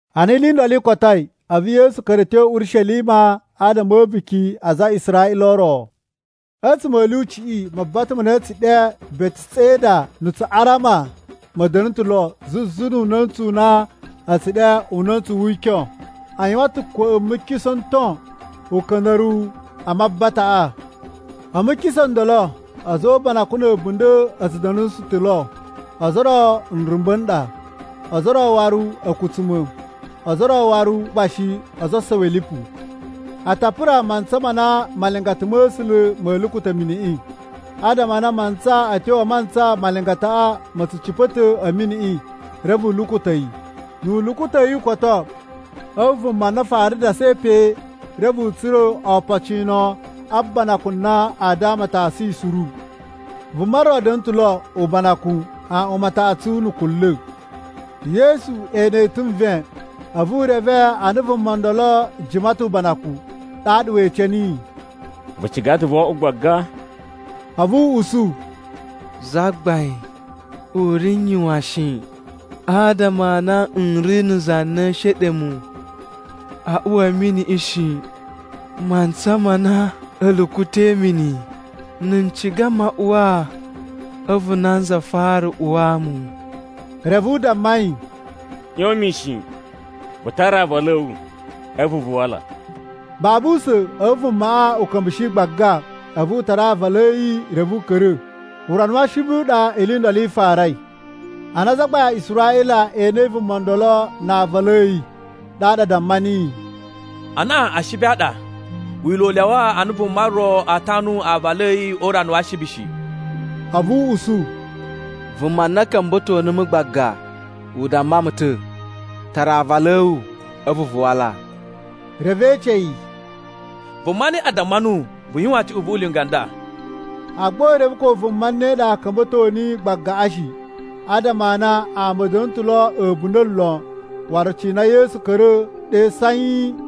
Ana ili i ndolo i kotoi, a̱vu Yesu ka̱ra̱ a̱ tyo Urishelima adama a̱ a̱buki a aza a Israꞌila o ro. A̱tsuma̱ a̱ lyuciꞌi, mabata ma na a̱ tsu ɗe Beteseda na̱ Tsuꞌarama ma̱ da̱na̱ ta̱ lo zuzu nu una̱ntsu u na a̱ tsu ɗe Una̱ntsu wi Ikyon. A yuwan ta̱ kwa̱ꞌa̱ a̱ mukisa̱ n ton uka̱nda̱ruwu a mabataꞌa. A̱ mukisa̱ n ndolo, a̱za̱ o ubanakun na̱ a̱bunda̱ a̱ tsu da̱nusu ta̱ lo, ozo o ro nrumba̱ n ɗa, ozo o ro waru a̱kutsuma̱, ozo o ro waru gba shi ozo o osowi a̱ lipu. [A ta pura mantsa ma na malingata ma̱ A̱sula̱ ma̱ lukuta̱ miniꞌi adama a na mantsa a̱ tyo mantsa malingataꞌa ma̱ tsu cipa̱ ta̱ a̱ miniꞌi, reve u lukuta̱ yi. Nu u lukuta̱ yi u koto, a̱vu vuma na fara dasai pe reve u tsura̱ opocino a banakun na a damatosun yi suru.] Vuma ro da̱na̱ ta̱ lo ubanakun aꞌwan mataꞌatsu na̱ kunla̱. Yesu ene yi ta̱ nven, a̱vu u reve a na vuma ndolo jima ta̱ ubanakun. Ɗaɗa we ece niyi, “Vu ciga ta̱ voo oꞌwo gbaga?” A̱vu u usu, “Zagbain, u ri n yuwan shi, adama a na n ri na̱ za na ee sheɗe mu a uwa a̱ miniꞌi shi, mantsa ma na a̱ lukuta̱i mini. Na̱ n ciga maꞌuwaa a̱vu nanza fara uwaa mu.” Reve u damma yi, “ꞌYon mishin, vu tara aavalu a̱ wu, a̱vu vu wala.” Babu usa̱n a̱vu vumaꞌa u ka̱mbushi gbaga. A̱vu u tara aavalu a̱ yi reve u ka̱ra̱. Urana wa Ashibi u ɗa ili i ndolo i farai. Ana azagbain a Israꞌila e enei vuma ndolo na aavalu a̱ yi, ɗaɗa a damma niyi, “Anaꞌan Ashibi a ɗa! Wila̱ u lyawa a na vuma ro a tanu aavalu a̱ yi o urana wa Ashibi shi.” A̱vu u usu, “Vuma na ka̱mba̱to numu gbaga u damma mu ta̱, ‘Tara aavalu a̱ wu, a̱vu vu wala.’” Reve e ece yi, “Vuma ne ɗa damma nuwu vu yuwan cuꞌun vu ulinga u nda?” Agba u reve ko vuma ne ɗa ka̱mba̱to niyi gbagaꞌa shi, adama a na ama a̱ da̱na̱ ta̱ lo a̱bunda̱ lon, waru cina Yesu ka̱ra̱ ɗe sanyi.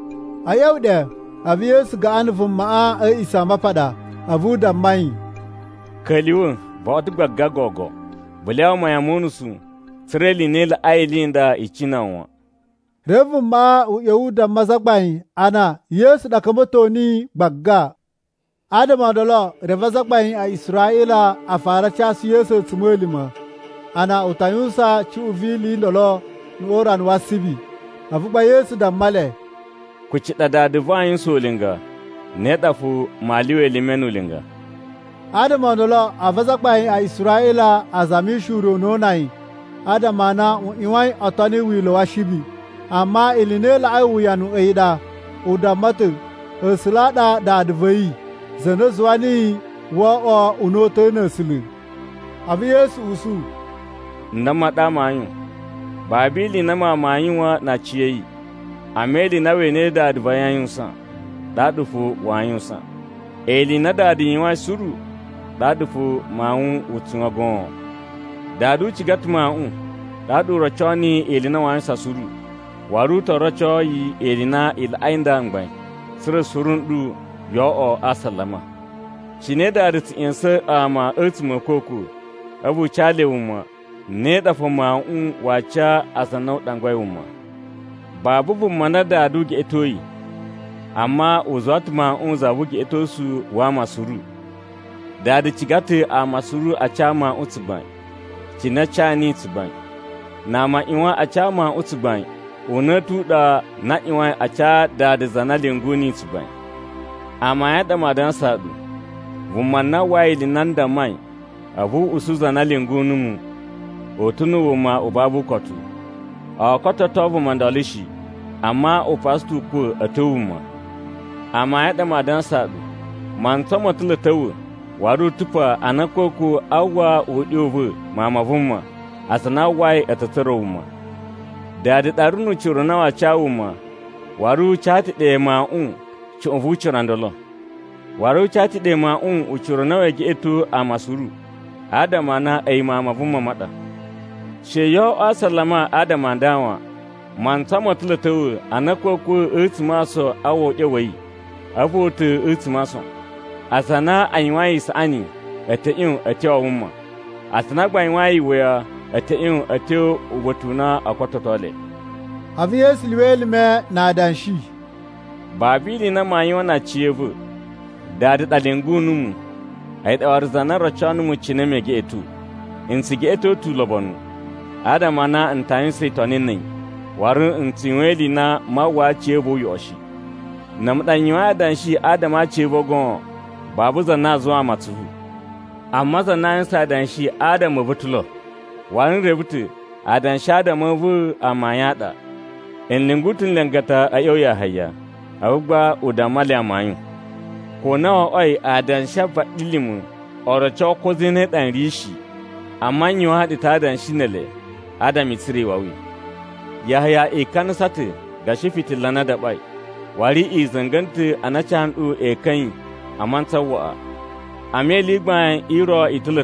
A̱ ꞌya̱wa̱ ɗe, a̱vu Yesu gaꞌan na̱ vumaꞌa a̱ A̱a̱ꞌisamapaɗa a̱vu u damma yi, “Ka̱lyuwa̱, vo oꞌwo ta̱ gbaga gogo. Vu lyawa mayan mo unusu tsa̱ra̱ ili i na i laꞌai ili i nda i cina wu wan.” Reve vumaꞌa u ꞌya̱wa̱ u damma azagbain a na Yesu ɗa ka̱mba̱to niyi gbagba. Adama o ndolo, reve azagbain a Israꞌila a fara a casu Yesu a̱tsuma̱lima̱ a na u ta yuwusan cuꞌun vi ili i ndolo o urana wa Ashibi. A̱vu gba Yesu damma le, “Kuci ɗa Dada va̱ aa yuwusan ulinga, ne ɗa fo maa lyuwa elime nu ulinga.” Adama o ndolo, a̱vu azagbain a Israꞌila a zamishi ure u na o una yi, adama a na u ꞌyuwain o toni wila̱ wa Ashibi. Amma ili i na i laꞌai uwuyanu a̱yi ɗa, u damma ta̱ A̱sula̱ a ɗa Dada va̱ yi, za na zuwa niyi wo oꞌwoi una̱ta̱ na̱ A̱sula̱. A̱vu Yesu usu, “N damma ɗu amayun, babu ili i na Mawun waa yuwan na aciya̱yi, amma ili i na we enei Dada a yuwusan, ɗaɗa fo waa yuwusan. Ili i na Dada yuwain suru, ɗaɗa fo Mawun u tsu yuwan goon. Dada u ciga ta̱ Mawuꞌun, ɗaɗa u roco niyi ili i na waa yuwusan suru. Waru u to roco yi ili i na i laꞌai nda mgbain, tsa̱ra̱ suru n ɗu yo oꞌwo a asalama. Cine Dada tsu ꞌya̱sa̱n ama a̱tsuma̱ a̱ a̱kwa̱kwa̱ a̱vu u ca le wuma, ne ɗa fo Mawuꞌun waa ca aza a na u ɗangwai wuma. Babu vuma na Dada u geꞌetoi, amma u zuwa ta̱ Mawuꞌun za vu ugeꞌetosu wa ama suru. Dada ciga ta̱ ama suru a ca Mawuꞌun tsugbain, cine a ca niyi tsugbain. Na ama a ꞌyuwan a ca Mawuꞌun tsugbain, una̱ta̱ u ɗa a na a ꞌyuwain a ca Dada za na lyungu niyi tsugbain. “Amayun a ɗa maa dansaa ɗu, vuma na uwwai ili i na n dammai a̱vu u usu za na lyungu numu, u ta̱ na̱ wuma u babu ukotu. O kototo vuma ndolo shi, amma u pasa ta̱ ukwa̱ a̱ tyo wuma. Amayun a ɗa maa dansaa ɗu, mantsa mo ta̱ lo a̱ ta̱wa̱ waru u ta̱ pa ana a̱kwa̱kwa̱ aa uwwa uɗyo u va̱ Mawun ma̱ A̱sula̱, aza a na a uwwai a̱ ta̱ tsura̱ wuma. Dada ɗa ri nu ucira u na waa ca wuma, waru u ca ta̱ ɗe Mawuꞌun cuꞌun vu ucira u ndolo. Waru u ca ta̱ ɗe Mawuꞌun ucira u na wee geꞌeto ama suru, adama a na a̱yi Mawun ma Vuma ma ɗa. “She yo oꞌwo a asalama adama a nda wan. Mantsa mo ta̱ lo a̱ ta̱wa̱ ana a̱kwa̱kwa̱ a̱tsuma̱ a ason aa uwwa uɗyo wa̱ yi, a̱vu o uta̱ a̱tsuma̱ a ason. Aza a na a yuwain isaꞌani a̱ ta̱ ꞌyon a̱ tyo a wuma, aza a na gba a yuwain iwuya a̱ ta̱ ꞌyon a̱ tyo uba̱ta̱ u na oo kototo le.” A̱vu Yesu lyuwa elime na adanshi, “Babu ili i na maa yuwan na aciya̱va̱. Dada ɗa lyungu numu, a̱yi ɗa waru za na roco numu cine mee geꞌeto. N tsu geꞌeto ta̱ ulobonu, adama a na n ta yuwusan itoni na̱ a̱yi, waru n tsu yuwan ili i na maa uwwaa aciya̱va̱ uyoꞌo shi. “Na̱ a̱mu ɗa n yuwain adanshi adama a aciya̱va̱ goon, babu za na aa zuwaa mu atsuvu. Amma za na aa yuwusan adanshi adama a̱ va̱ ta̱ lo, waru n reve ta̱ adanshi adama a̱ va̱ amayun a ɗa. “I lyungu ta̱ nlingata a̱ ꞌya̱wa̱ ya Yahaya, a̱vu gba u damma le amayun. Ko na wo oꞌwoi adanshi a vaɗilima̱ o roco ko zane ɗa n ri shi, amma n yuwaan ɗu ta̱ adanshi ne ele adama i tsura̱ iwawi. Yahaya ikanasa ta̱ gashi fitila na a daɓai, waru i za̱nga̱na̱ ta̱ a na a ca nɗu ekan a̱ yi a mantsa waꞌa. “Amma ili i gbain i ro i ta̱ lo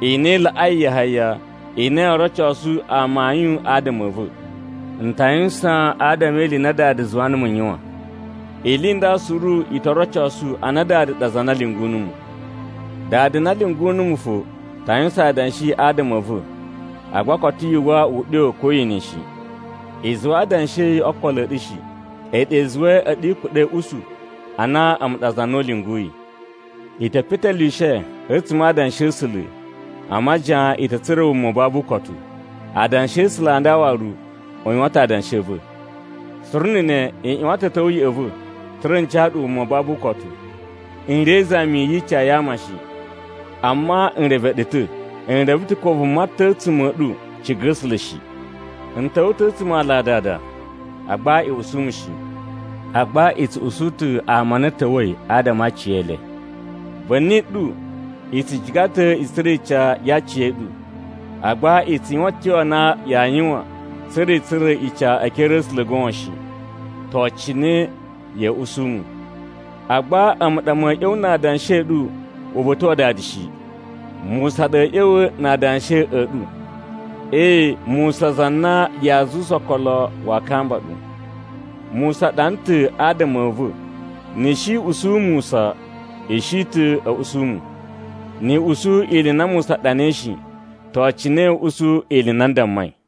i na i laꞌai Yahaya i na yoo rocosu amayun adama a̱ va̱. N ta yuwusan adama e ili i na Dada zuwa numu n yuwan! Ili i nda suru i to rocosu a na Dada ɗa za na lyungu numu. Dada na lyungu numu fo ta yuwusan adanshi adama a̱ va̱, agba koto yu uwwa uɗyo ko ye ene yi shi. I zuwa adanshi a̱ yi o okolo a̱ ɗu shi, a̱yi ɗa i zuwai a̱ɗu i kuɗa̱i a̱ usu a na a̱mu ɗa za na u lyunguyi. I te petelyuwushe a̱tsuma̱ a Adanshi a̱ A̱sula̱ a majiyan i ta̱ tsura̱ wuma u babu ukotu. Adanshi a̱ A̱sula̱ a nda waru u yuwan ta̱ adanshi a̱ va̱! Suru na̱ ne i ꞌyuwan ta̱ a̱ ta̱wa̱ ya̱ꞌa̱ va̱, tsa̱ra̱ n ca ɗu wuma u babu ukotu. “N ri e izami yi ica ya ama shi. Amma n reve ɗu ta̱. N reve ta̱ ko vuma ta̱ a̱tsuma̱ a̱ ɗu ciga A̱sula̱ shi. N ta̱wa̱ ta̱ a̱tsuma̱ a ala a Dada, agba i usu mu shi. Agba i tsu usu ta̱ ama a na a̱ ta̱wa̱i adama a aciyele. Va̱ni ɗu i tsu ciga ta̱ i tsura̱ ica ya aciya̱ɗu, agba i tsu yuwan a̱tyo a na yaa yuwan, tsa̱ra̱ i tsura̱ ica e ekere a̱ A̱sula̱ goon shi. To, cine ya̱a̱ usu mu? “Agba a̱mu ɗa ma̱a̱ ꞌya̱wa̱ na adanshi a̱ ɗu uba̱ta̱ wa Dada shi. Musa ɗa a̱a̱ ꞌya̱wa̱ na adanshi a̱ ɗu! Ee, Musa za na yaa zuwusa okolo waa kamba ɗu. Musa ɗana ta̱ adama a̱ va̱. Ni i shi i usu Musa, i shi ta̱ usu mu. Ni i usu ili i na Musa ɗanai shi, to, cine ya̱a̱ usu ili i na n dammai?”